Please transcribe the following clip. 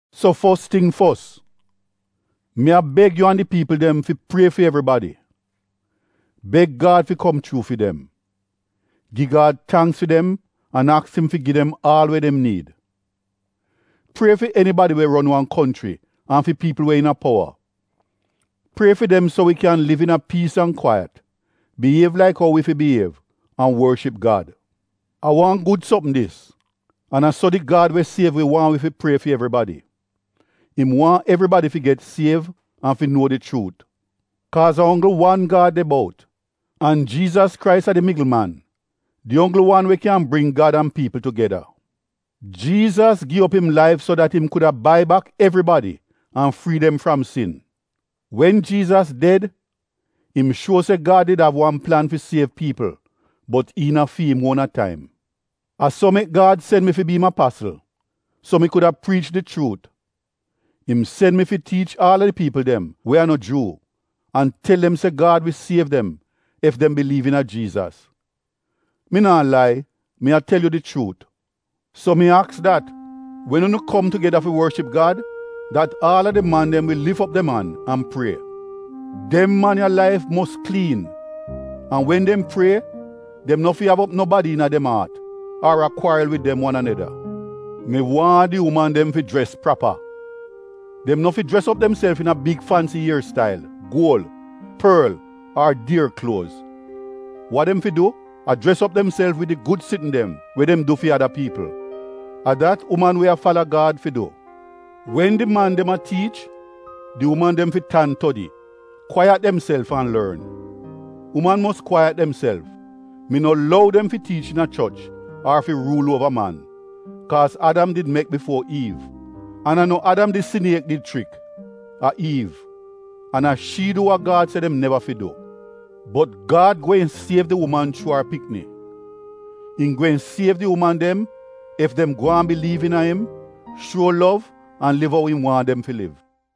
So fos ting fos, mi a beg yu an di piipl dem fi prie fi evribadi. Beg Gad fi kom chuu fi dem. Gi Gad tangks fi dem an aks im fi gi dem aal we dem niid. Prie fi enibadi we ron wan konchri an fi piipl we iina powa. Prie fi dem so wi kyan liv iina piis an kwaiyat, biyiev laik ou wi fi biyiev an worship Gad. A wan gud sopm dis an a so di Gad we siev wi waahn wi fi prie fi evribadi. Im waahn evribadi fi get siev an fi nuo di chuut. Kaaz a onggl wan Gad de bout, an Jiizas Krais a di migl man, di onggl wan we kyan bring Gad an piipl tugeda. Jiizas gi op im laif so dat im kuda bai bak evribadi an frii dem fram sin. Wen Jiizas ded, im shuo se Gad did av wan plan fi siev piipl bot iina fi im uona taim. A so mek Gad sen mi fi bi im apasl, so mi kuda priich di chuut. Im sen mi fi tiich aal a di piipl dem we a no Juu an tel dem se Gad wi siev dem ef dem biliiv iina Jiizas. Mi naa lai, mi a tel yu di chuut. So mi aks dat wen unu kom tugeda fi worship Gad, dat aal a di man dem wi lif op dem an, an prie. Dem man ya laif mos kliin an wen dem a prie dem no fi av no bad fiilinz fi nobadi ar a kwaril wid dem wan aneda. Mi waahn di uman dem fi jres prapa. Dem no fi jres op demself iina big fansi ier stail, guol, porl ar dier kluoz. Wa dem fi du a jres op demself wid di gud sitn dem we dem du fi ada piipl. A dat uman we a fala Gad fi du. Wen di man dem a tiich, di uman dem fi tan todi, kwaiyat demself an lorn. Uman mos kwaiyat demself, mi no lou dem fi tiich iina choch ar fi ruul uova man. Kaaz Adam did mek bifuo Iiv. An a no Adam di siniek did chrik, a Iiv an a shi du wa Gad se dem neva fi du. Bot Gad gweehn siev di uman chuu ar pikni. Im gweehn siev di uman dem ef dem gwaan biliiv iina im, shuo lov an liv ou im waahn dem fi liv.